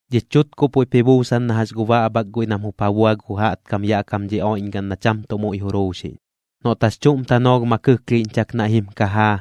Dhich chutkuꞌ puiꞌp ji buusan na jax gu baꞌbhak guiꞌ nam jup ja bua gu jaꞌtkam yaꞌ dhi oiꞌñgaꞌn na cham tuꞌ muiꞌ juruuxiꞌñ. Noꞌt jax chuꞌm tanoolh ma kɨklhiiꞌñchak naiꞌ jim kajaa,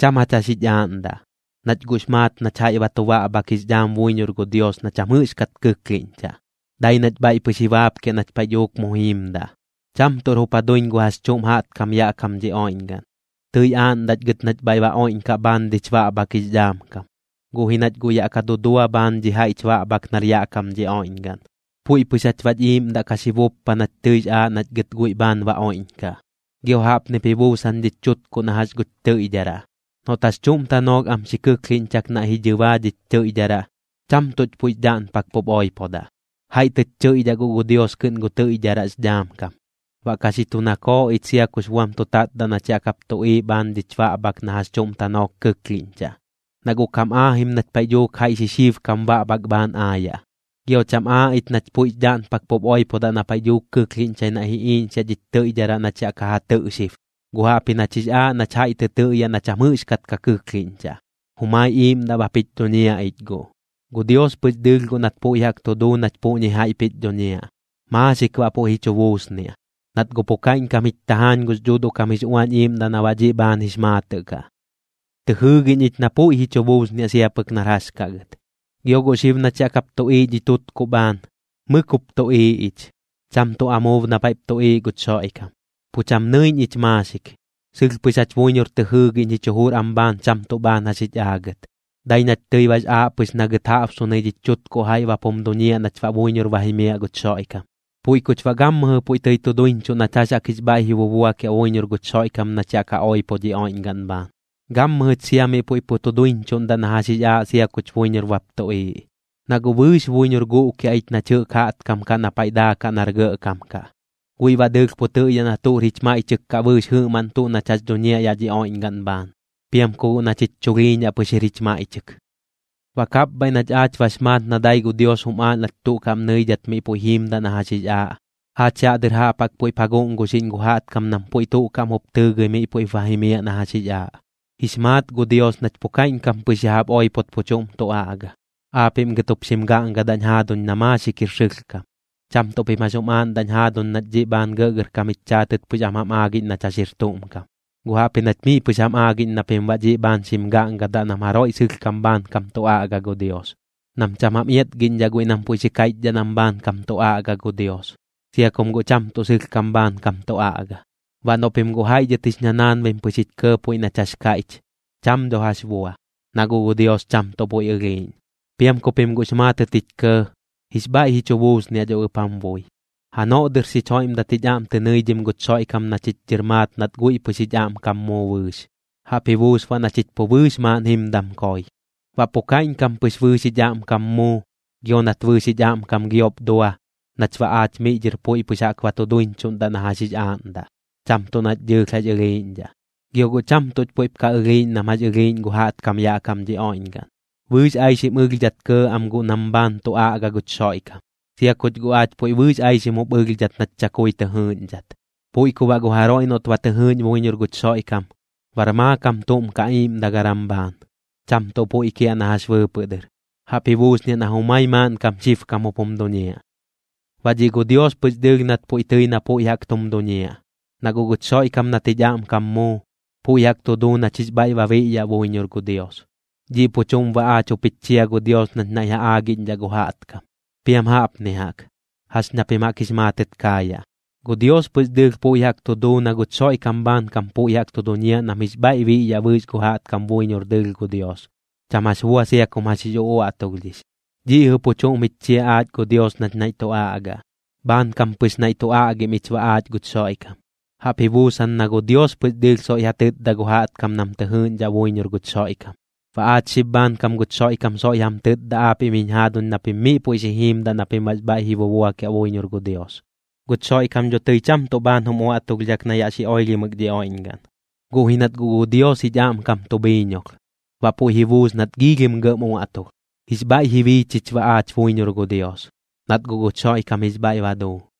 cham jach jax jich aaꞌndaꞌ, nach guꞌx maat nach jaiꞌ ba tu baꞌbhak jix dhaam buiñor gu Dios na cham jɨꞌxkat kɨklhiꞌñchaꞌ, dai nach bhaiꞌ pɨx ji baapkiaꞌ nach paiꞌ dhuuk mu jiimdaꞌ. Cham tuꞌr jup ja duiñ gu jax chuꞌm jaꞌtkam yaꞌ kam dhi oiꞌñgaꞌn. Tɨi aaꞌndaꞌch gɨt nach bhaiꞌ ba oiꞌñkaꞌ bhaan dhich baꞌbhak jix dhaam kam, guꞌ ji nach guꞌ yaꞌ ka dudua bhaan dhi jaiꞌch baꞌbhak nar yaꞌ kam dhi oiꞌñgaꞌn. Puiꞌ pɨx jach baꞌch iiꞌmdaꞌ ka xi buppa nach tɨix aaꞌ nach gɨt guiꞌ bhaan ba oiꞌñkaꞌ. Gio jaꞌpnip ji buusan dhich chutkuꞌ na jax guch tɨiꞌdharaꞌ. Noꞌt jax chuꞌm tanoolh am xi kɨklhiꞌñchak naiꞌ ji dhɨbaa dhich tɨiꞌdharaꞌ, cham tuꞌch puiꞌx dhaꞌnpak pup oipodaꞌ, jaiꞌ tɨch chɨiꞌdhaꞌ guꞌ gu Dios kɨꞌn gu tɨiꞌdharaꞌx dhaam kam. Baꞌ ka xi tu nakooꞌ ich sia kux buam tu tatdaꞌ nach yaꞌ kap tuꞌiiꞌ bhaan dhich baꞌbhak na jax chuꞌm tanoolh kɨklhiꞌñchaꞌ, na guꞌ kam aajim nach paiꞌ dhuuk jaiꞌ xixiibkam baꞌbhak bhaan aayaꞌ. Gio cham aaꞌ ich nach puiꞌx dhaꞌnpak pup oipodaꞌ na paiꞌ dhuuk kɨklhiꞌñchai naiꞌ ji iiꞌñxiaꞌ dhich tɨiꞌdharaꞌ nach yaꞌ ka ja tɨꞌ xib, guꞌ jaꞌpji nach jix aaꞌ nach jaiꞌ tɨ tɨꞌyaꞌ na cham jɨꞌxkat ka kɨklhiꞌñchaꞌ, jumai iiꞌmdaꞌ bap jich dhuñiaꞌ ich guꞌ. Gu Dios pɨx dɨɨlh guꞌ nat puiꞌ jaꞌk tu duu nach puꞌñi jaiꞌp jich dhuñiaꞌ, maaxik baꞌ puiꞌ ji chu buusniaꞌ, nat guꞌ pu kaiꞌñkam jich tajaañ gux Dhuuduꞌ kam jix Uañ Iiꞌmdaꞌ na baꞌ dhiꞌ bhaan jix maatɨꞌ kaꞌ. Tɨ jɨɨgiꞌñ ich na puiꞌ ji chu buusniaꞌ sia pɨk nar jax kaꞌ gɨt. Gio guꞌ xib nach yaꞌ kap tuꞌiiꞌ dhi tutkuꞌ bhaan, mɨk jup tuꞌiiꞌ ich, cham tuꞌ amuub na paiꞌp tuꞌiiꞌ guch Xoiꞌkam. Pu cham nɨiꞌñ ich maaxik, sɨlh pɨx jach buiñor tɨ jɨɨgiꞌñ jich jujur am bhaan cham tuꞌ bhaan jax jich aagɨt, dai nach tɨi bax aaꞌ pɨx na gɨt jaꞌbsunɨi dhich chutkuꞌ jaiꞌ bap jum duñiaꞌ nach baꞌ buiñor ba jimiaꞌ guch Xoiꞌkam. Puiꞌ kuch baꞌ gammɨjɨ puiꞌ tɨi tu duiñchuꞌ nach jax jaꞌk jix bhaiꞌ ji bubuakiaꞌ buiñor guch Xoiꞌkam nach yaꞌ ka oipo dhi oiꞌñgaꞌn bhaan, gammɨjɨch sia miꞌ puiꞌ pu tu duiñchuꞌndaꞌ na jax jix aaꞌ sia kuch buiñor bap tuꞌiiꞌ. Na guꞌ bɨɨx buiñor guꞌkiaꞌ ich nach jɨꞌk jaꞌtkam kaꞌ na paiꞌ daakaꞌ nar gɇꞌkam kaꞌ, guiꞌ baꞌ dɨɨlh pu tɨꞌyaꞌ na tuꞌr jich maiꞌchɨk kaꞌ bɨɨx jɨꞌmaꞌn tuꞌ nach jax dhuñiaꞌ yaꞌ dhi oiꞌñgaꞌn bhaan, piam ku guꞌ nach jich chulhiiñaꞌ pɨx jir jich maiꞌchɨk. Baꞌ kapbhaiꞌ nach aach bax maat na dai gu Dios jum aaꞌ nach tuꞌ kaꞌm nɨidhat miꞌ puiꞌ jiimdaꞌ na jax jix aaꞌ, aach yaꞌ dɨr jaꞌp jaꞌk puiꞌp ja guꞌnguxiꞌñ gu jaꞌtkam nam puiꞌ tuꞌ kaꞌm jup tɨɨgɨi miꞌ puiꞌp ba jimiaꞌ na jax jix aaꞌ. Jix maat gu Dios nach pu kaiꞌñkam pɨx ya jaꞌp oipot pu chuꞌm tu aꞌga, aapiꞌm gɨt jup xim gaꞌngadaꞌñ jaaduñ na maaxik jir sɨlhkam. Cham tuꞌ pim jax jum aaꞌndaꞌñ jaaduñ nach dhiꞌ bhaan gɇꞌgɇrkam jich chaatɨt pɨx am jam aagiꞌñ nach jax jir tuꞌm kam, guꞌ jaꞌpji nach miꞌ pɨx jam aagiꞌñ na pim baꞌ dhiꞌ bhaan xim gaꞌngadaꞌ nam jaroiꞌ sɨlhkam bhaankam tu aꞌga gu Dios, nam cham jam iatgiꞌñdhaꞌ guiꞌ nam puiꞌ xi kaiꞌchdhaꞌ nam bhaankam tu aꞌga gu Dios, sia kum guꞌ cham tuꞌ sɨlhkam bhaankam tu aꞌga. Baꞌ noꞌ pim guꞌ jaiꞌ dhɨt jix ñanaanbim pɨx jich kɇɇ puiꞌ nach jax kaiꞌch, cham dho jax bua, na guꞌ gu Dios cham tuꞌ puiꞌ ɨlhiiꞌñ. Piam ku pim guꞌx maatɨt jich kɇɇ, jix bhaiꞌ ji chu buusniaꞌ dho ɨp jam bui. Janoꞌ dɨr xich joiꞌmdat jich aꞌm tɨ nɨidhim guch Xoiꞌkam na chich dhɨr maat nat guiꞌ pɨx jich aꞌmkam muu bɨɨx, jaꞌp ji buus baꞌ na chich pu bɨɨx maaꞌn jimdam koi. Baꞌ pu kaiꞌñkam pɨx bɨɨx jich aꞌmkam muu gio nat bɨɨx jich aꞌmkam giop dua, nach baꞌ aach miꞌ dhɨr puiꞌ pɨx jaꞌk ba tu duiñchuꞌndaꞌ na jax jix aaꞌndaꞌ, cham tuꞌ nach dɨɨlh jax ɨlhiiꞌñdhaꞌ. Gio guꞌ cham tuꞌch puiꞌp ka ɨlhiiꞌñ nam jax ɨlhiiꞌñ gu jaꞌtkam yaꞌ kam dhi oiꞌñgaꞌn, bɨɨx aixim ɨlhdhat kɇɇ am guꞌ nam bhaan tu aꞌga guch Xoiꞌkam, sia kuch guꞌ aach puiꞌ bɨɨx aixim jup ɨlhdhat nach chakui tɨ jɨɨꞌñdhat. Puiꞌ ku baꞌ gu jaroiꞌ noꞌt ba tɨ jɨɨꞌñ buiñor guch Xoiꞌkam, bar maakam tuꞌm kaꞌ iiꞌmdagaram bhaan, cham tuꞌ puiꞌ kiaꞌ na jax bɨɨpɨꞌ dɨr. Jaꞌp ji buusniaꞌ na jumai maaꞌnkam xibkam jup jum duñiaꞌ. Baꞌ dhiꞌ gu Dios pɨx dɨɨlh nat puiꞌ tɨi na puiꞌ jaꞌk tum duñiaꞌ. Na guꞌ guch Xoiꞌkam nat jich aꞌmkam muu, puiꞌ jaꞌk tu duu nach jix bhaiꞌ ba biꞌyaꞌ buiñor gu Dios. Dhiꞌ pu chuꞌm baꞌ aach jup jich chia gu Dios nach naiꞌ ja aagiꞌñdhaꞌ gu jaꞌtkam. Piam jaꞌpni jaꞌk, jax na pim jaꞌk jix maatɨt kaayaꞌ: Gu Dios pɨx dɨɨlh puiꞌ jaꞌk tu duu na guch Xoiꞌkam bhaankam puiꞌ jaꞌk tu duñiaꞌ nam jix bhaiꞌ biꞌyaꞌ bɨɨx gu jaꞌtkam buiñor dɨɨlh gu Dios, cham jax bua sia kum jax jix uꞌuaꞌtulhdhix. Dhiꞌ jɨꞌ pu chuꞌm jich chia aach gu Dios nach naiꞌ tu aꞌgaꞌ. Bhaankam pɨx naiꞌ tu aꞌgim ich baꞌ aach guch Xoiꞌkam, jaꞌp ji buusan na gu Dios pɨx dɨɨlh soiꞌ ja tɨtda gu jaꞌtkam nam tɨ jɨɨꞌñdhaꞌ buiñor guch Xoiꞌkam. Baꞌ aach xib bhaankam guch Xoiꞌkam soiꞌ jam tɨtda aapiꞌm jiñ jaaduñ na pim miꞌ puiꞌ xi jiimdaꞌ na pim baꞌx bhaiꞌ ji bubuakiaꞌ buiñor gu Dios. Guch Xoiꞌkam dho tɨi cham tuꞌ tuꞌ bhaan jum uaꞌtulhdhak na yaꞌ xi oilhimɨk dhi oiꞌñgaꞌn, guꞌ ji nat guꞌ gu Dios jich aꞌmkam tu bhiiñolh, baꞌ puiꞌ ji buus nat giilhim gɇꞌm uaꞌtulh. Jix bhaiꞌ ji bii chich baꞌ aach buiñor gu Dios, nat guꞌ guch Xoiꞌkam jix bhaiꞌ ba duu.